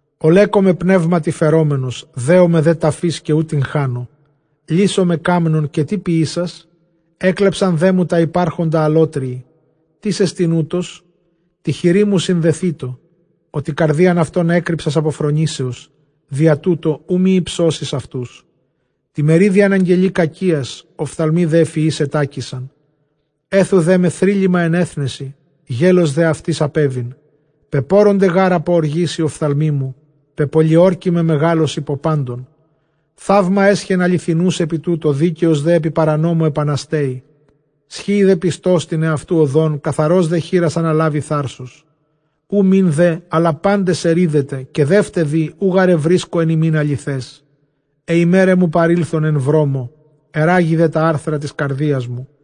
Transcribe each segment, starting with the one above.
Ὀλέκομαι πνεύματι φερόμενος, δέομαι δὲ ταφῆς, καὶ οὐ τυγχάνω. Λίσσομαι κάμνων, καὶ τί ποιήσας; ἔκλεψαν δέ μου τὰ ὑπάρχοντα ἀλλότριοι. Τίς ἐστιν οὕτος; τῇ χειρί μου συνδεθήτω. Ὅτι καρδίαν αὐτῶν ἔκρυψας ἀπὸ φρονήσεως, διὰ τοῦτο οὐ μὴ ὑψώσῃς αὐτούς. Τῇ μερίδι ἀναγγελεῖ κακίας· ὀφθαλμοὶ δὲ ἐφʼ υἱοῖς ἐτάκησαν. Ἔθου δέ με θρύλλημα ἐν ἔθνεσι, γέλως δὲ αὐτοῖς ἀπέβην. Πεπώρωνται γὰρ ἀπὸ ὀργῆς οἱ ὀφθαλμοί μου, πεπολιόρκημαι μεγάλως ὑπὸ πάντων. Θαῦμα ἔσχεν ἀληθινοὺς ἐπὶ τούτῳ, δίκαιος δὲ ἐπὶ παρανόμῳ ἐπανασταίη. Σχοίη δὲ πιστὸς τὴν ἑαυτοῦ ὁδὸν, καθαρὸς δὲ χεῖρας ἀναλάβοι θάρσος. Οὐ μὴν δὲ ἀλλὰ πάντες ἐρείδετε καὶ δεῦτε δὴ, οὐ γὰρ εὑρίσκω ἐν ὑμῖν ἀληθές. Αἱ ἡμέραι μου παρῆλθον ἐν βρόμῳ, ἐῤῥάγη δὲ τὰ ἄρθρα τῆς καρδίας μου.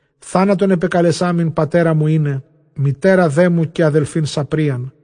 Θάνατον ἐπεκαλεσάμην πατέρα μου εἶναι, μητέρα δέ μου καὶ ἀδελφὴν σαπρίαν.